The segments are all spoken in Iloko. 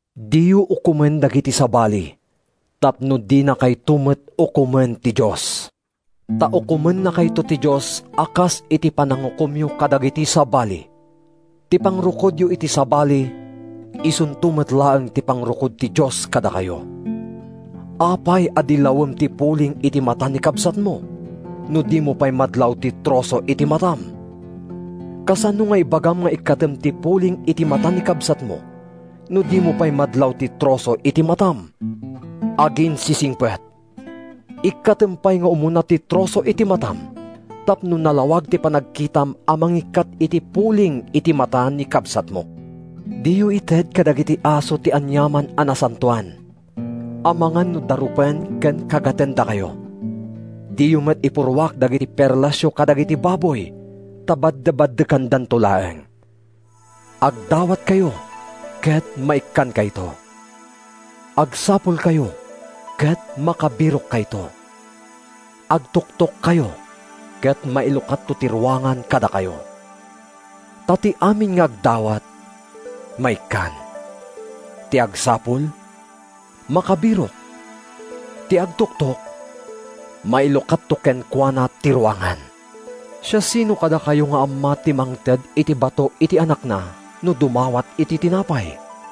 “Diyo ukomen dagiti sabali tapno dinakayto met ukomen ti Dios, ta ukomennakayto ti Dios a kas iti panangukomyo kadagiti sabali. Ti pangrukodyo iti sabali isunto met laeng ti pangrukod ti Dios kadakayo. Apay a dillawem ti puling iti mata ni kabsatmo, no dimo pay madlaw ti troso iti matam? Kasano nga ibagam nga ikkatem ti puling iti mata ni kabsatmo no dimo pay madlaw ti troso iti matam? Aginsisingpet! Ikkatem pay nga umuna ti troso iti matam, tapno nalawag ti panagkitam a mangikkat iti puling iti mata ni kabsatmo. “Diyo ited kadagiti aso ti aniaman a nasantoan, amangan no darupen ken kagatendakayo. Diyo met ipurruak dagiti perlasyo kadagiti baboy—ta baddebaddekandanto laeng.” “Agdawatkayo ket maikkankayto; agsapulkayo ket makabirokkayto; agtuktokkayo ket mailukatto ti ruangan kadakayo. Ta ti amin nga agdawat, maikkan; ti agsapul, makabirok; ti agtuktok, mailukatto kenkuana ti ruangan. Siasino kadakayo nga amma ti mangted iti bato iti anakna no dumawat iti tinapay?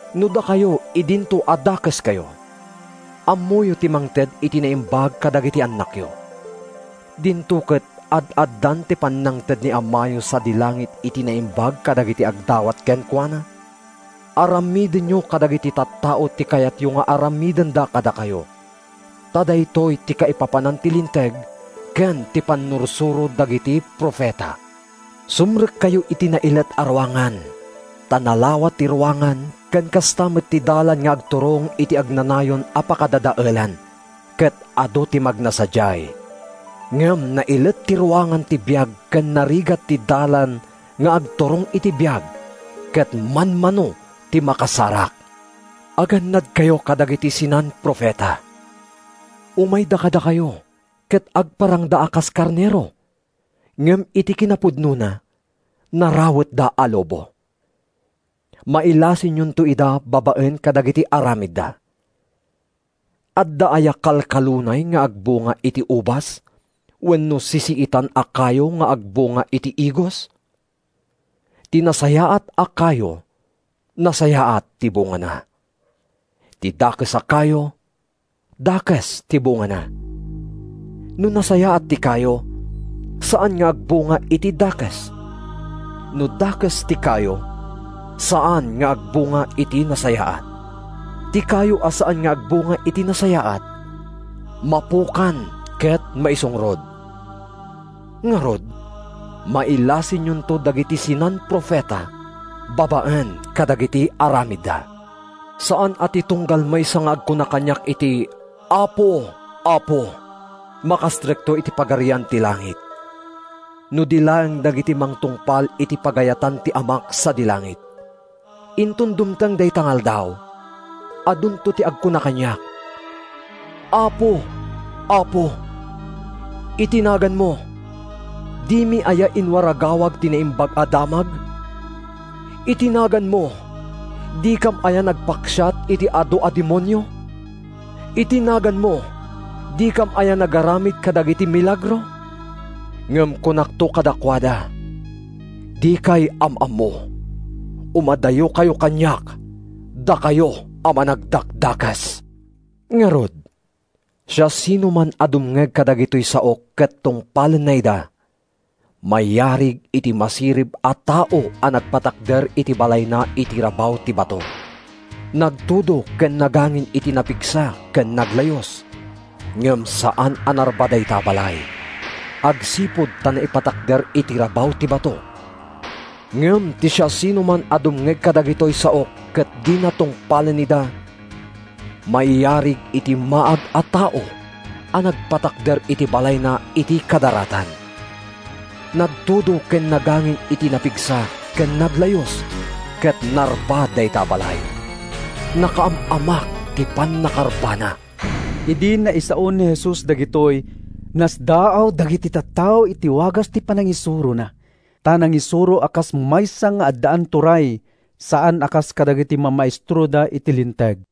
No dakayo idinto a dakeskayo, ammoyo ti mangted iti naimbag kadagiti annakyo, dinto ket ad-addan ti pannangted ni Amayo sadi langit iti naimbag kadagiti agdawat kenkuana? “Aramidenyo kadagiti tattao ti kayatyo nga aramidenda kadakayo; ta daytoy ti kaipapanan ti Linteg ken ti pannursuro dagiti profeta.” “Sumrekkayo iti nailet a ruangan, ta nalawa ti ruangan ken kasta met ti dalan nga agturong iti agnanayon a pakadadaelan, ket adu ti magna sadiay. Ngem nailet ti ruangan ti biag ken narigat ti dalan nga agturong iti biag, ket manmano ti makasarak.” “Agannadkayo kadagiti sinan-profeta. Umayda kadakayo ket agparangda a kas karnero, ngem iti kinapudnona, narawetda a lobo. Mailasinyonto ida babaen kadagiti aramidda. Adda aya kalkalunay nga agbunga iti ubas, wenno sisiitan a kayo nga agbunga iti igos? Ti nasayaat a kayo nasayaat ti bungana; ti dakes a kayo dakes ti bungana. No nasayaat ti kayo, saan nga agbunga iti dakes; no dakes ti kayo, saan nga agbunga iti nasayaat. Ti kayo a saan nga agbunga iti nasayaat, mapukan ket maisungrod. Ngarud, mailasinyonto dagiti sinan-profeta babaen kadagiti aramidda.” “Saan a ti tunggal maysa nga agkuna kaniak iti ‘Apo, Apo,’ makastrekto iti Pagarian ti langit, no di laeng dagiti mangtungpal iti pagayatan ni Amak sadi langit. Inton dumteng dayta nga Aldaw, adunto ti agkuna kaniak, ‘Apo, Apo! Iti naganmo, dimi aya inwaragawag ti Naimbag a Damag? Iti naganmo, dikam aya nagpaksiat iti adu a demonio? Iti naganmo, dikam aya nagaramid kadagiti milagro?’ Ngem kunakto kadakuada, ‘Dikay am-ammo! Umadayokayo kaniak, dakayo a managdakdakes!’” “Ngarud, siasinoman a dumngeg kadagitoy saok ket tungpalenna ida, mayarig iti masirib a tao a nagpatakder iti balayna iti rabaw ti bato. Nagtudo ken nagangin iti napigsa ken naglayus, ngem saan a narba dayta a balay, agsipud ta naipatakder iti rabaw ti bato. Ngem ti siasinoman a dumngeg kadagitoy saok ket dina tungpalen ida, mayarig iti maag a tao a nagpatakder iti balayna iti kadaratan. Nagtudo ken nagangin iti napigsa ken naglayus ket narba dayta a balay. Nakaam-amak ti pannakarbana!” Idi naisaon ni Jesus dagitoy, nasdaaw dagiti tattao iti wagas ti panangisurona. Ta nangisuro a kas maysa nga addaan turay, saan a kas kadagiti mamaestroda iti Linteg.